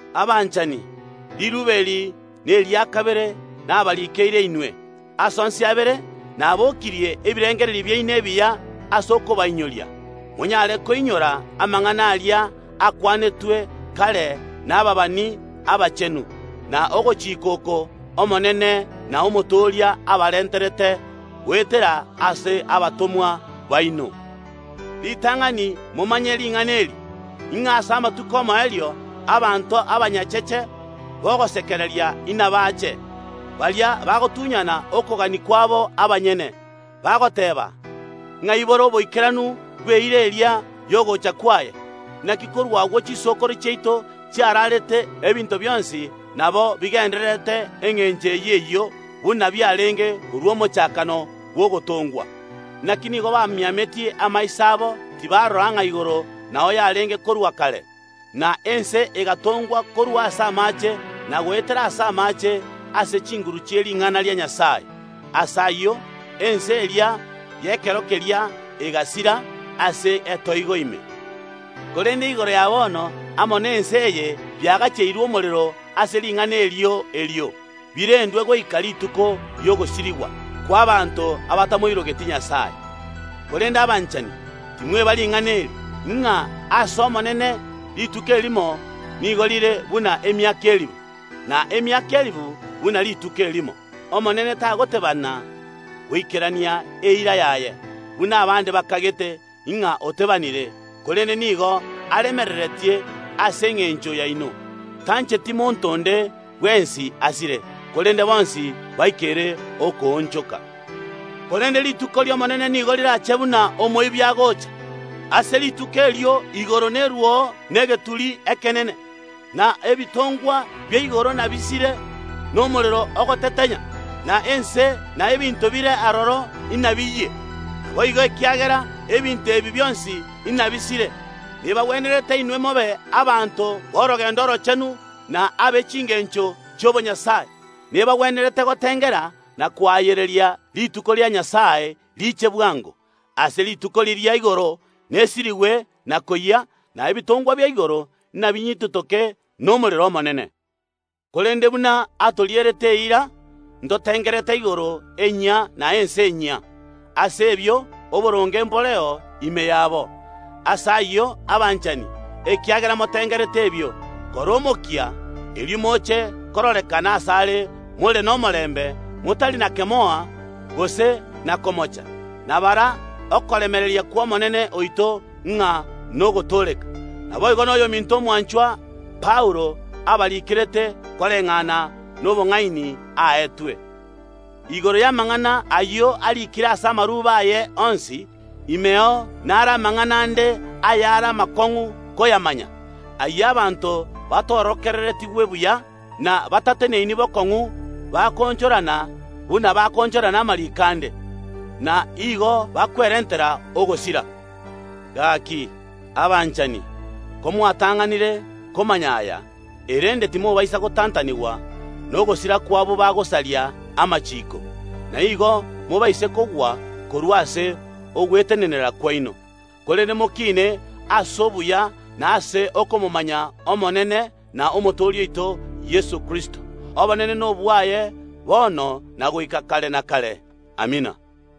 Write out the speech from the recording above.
Abanchani, riruube eri neria kabere nabarikeire inwe. Ase onsi abere nabokirie ebirengererio biaino ebiya ase okobainyoria, monyare koinyora amang’ana aria akwanetwe kare nababani abachenu, na ogochika kw’Omonene na Omotooria abarenterete goetera ase abatomwa baino. Ritang’ani momanye ring’ana eri, ng’a ase amatuko omoerio abanto abanyacheche b’ogosekereria inabache, baria bagotunyana okogania kwabo abanyene, bagoteeba, “Ng’ai bore oboikeranu bw’eira eria y’ogocha kwaye? Naki korwa agwo chisokoro chiaito chiaraarete ebinto bionsi nabo bigendererete engencho eyio eyio, buna biarenge korwa omochakano bw’ogotongwa.” Naki nigo bamiametie amaiso abo tibarora ng’a igoro nao yarenge korwa kare, na ense egatongwa korwa ase amaache, na goetera ase amaache, ase chinguru chi’ering’ana ria Nyasae. Ase ayio, ense eria y’ekero keria egasira ase etoigo ime. Korende igoro ya bono amo na ense eye biagacheirwe omorero ase ring’ana erio erio, birendwe goika rituko ri’ogosirigwa kw’abaanto abatamoirogeti Nyasae. Korende abanchani, timweba ring’ana eri, ng’a ase Omonene rituko erimo nigo rire buna emiaka elifu, na emiaka elifu buna rituko erimo. Omonene tagoteebana goikerania, eira yaye, buna abande bakagete ng’a otebanire, korende nigo aremereretie ase engencho yaino, tancheti monto onde bwensi asire, korende bonsi baikere okoonchoka. Korende rituko ri’Omonene nigo rirache buna omoibi agoocha. Ase rituko erio igoro neruo negeturi ekenene, na ebitongwa bia igoro inabisire nomorero ogotetenya, na ense na ebinto ebire aroro inabiyie. Naboigo, ekiagera ebinto ebi bionsi nabisire, nebagwenerete inwe mobe abanto b’orogendo oroochenu na abe chingencho chi’obonyasae. Nebagwenerete gotengera na koayereria rituko ria Nyasae riiche bwango. Ase rituko riria igoro nesirigwe na koyia, na ebitongwa bia igoro inabinyititoke nomorero omonene. Korende buna atorierete eira ntotengerete igoro enyia na ense enyia, ase ebio oboronge mboreo ime yabo. Ase ayio abanchani, ekiagera motengerete ebio, kora omokia, erio moche kororekana asare more nomorembe, motari na kemoa gose na komocha. Na bara okoremereria kw’Omonene oito ng’a nogotooreka. Naboigo noyominto omwanchwa, Paulo, abarikerete koreng’ana nobong’aini aetwe. Igoro y’amang’ana ayio ariikire ase amarube aye onsi. Imeo nare amang’ana ande ayare amakong’u koyamanya, ayio abanto batorokereretigwe buya na batateneini bokong’u bakoonchorana, buna bakoonchorana amariiko ande, na igo bakwerentera ogosira. Gaki, abanchani, komwatang’anire komanya aya, erende timobaisa gotantanigwa nogosira kw’abwo bagosaria amachiiko, na igo mobaise kogwa korwa ase ogwetenenera kwaino. Korende mokine ase obuya na ase okomomanya Omonene na Omotooria oito Yeso Kristo. Obonene nobwaye bono na goika kare na kare. Amina.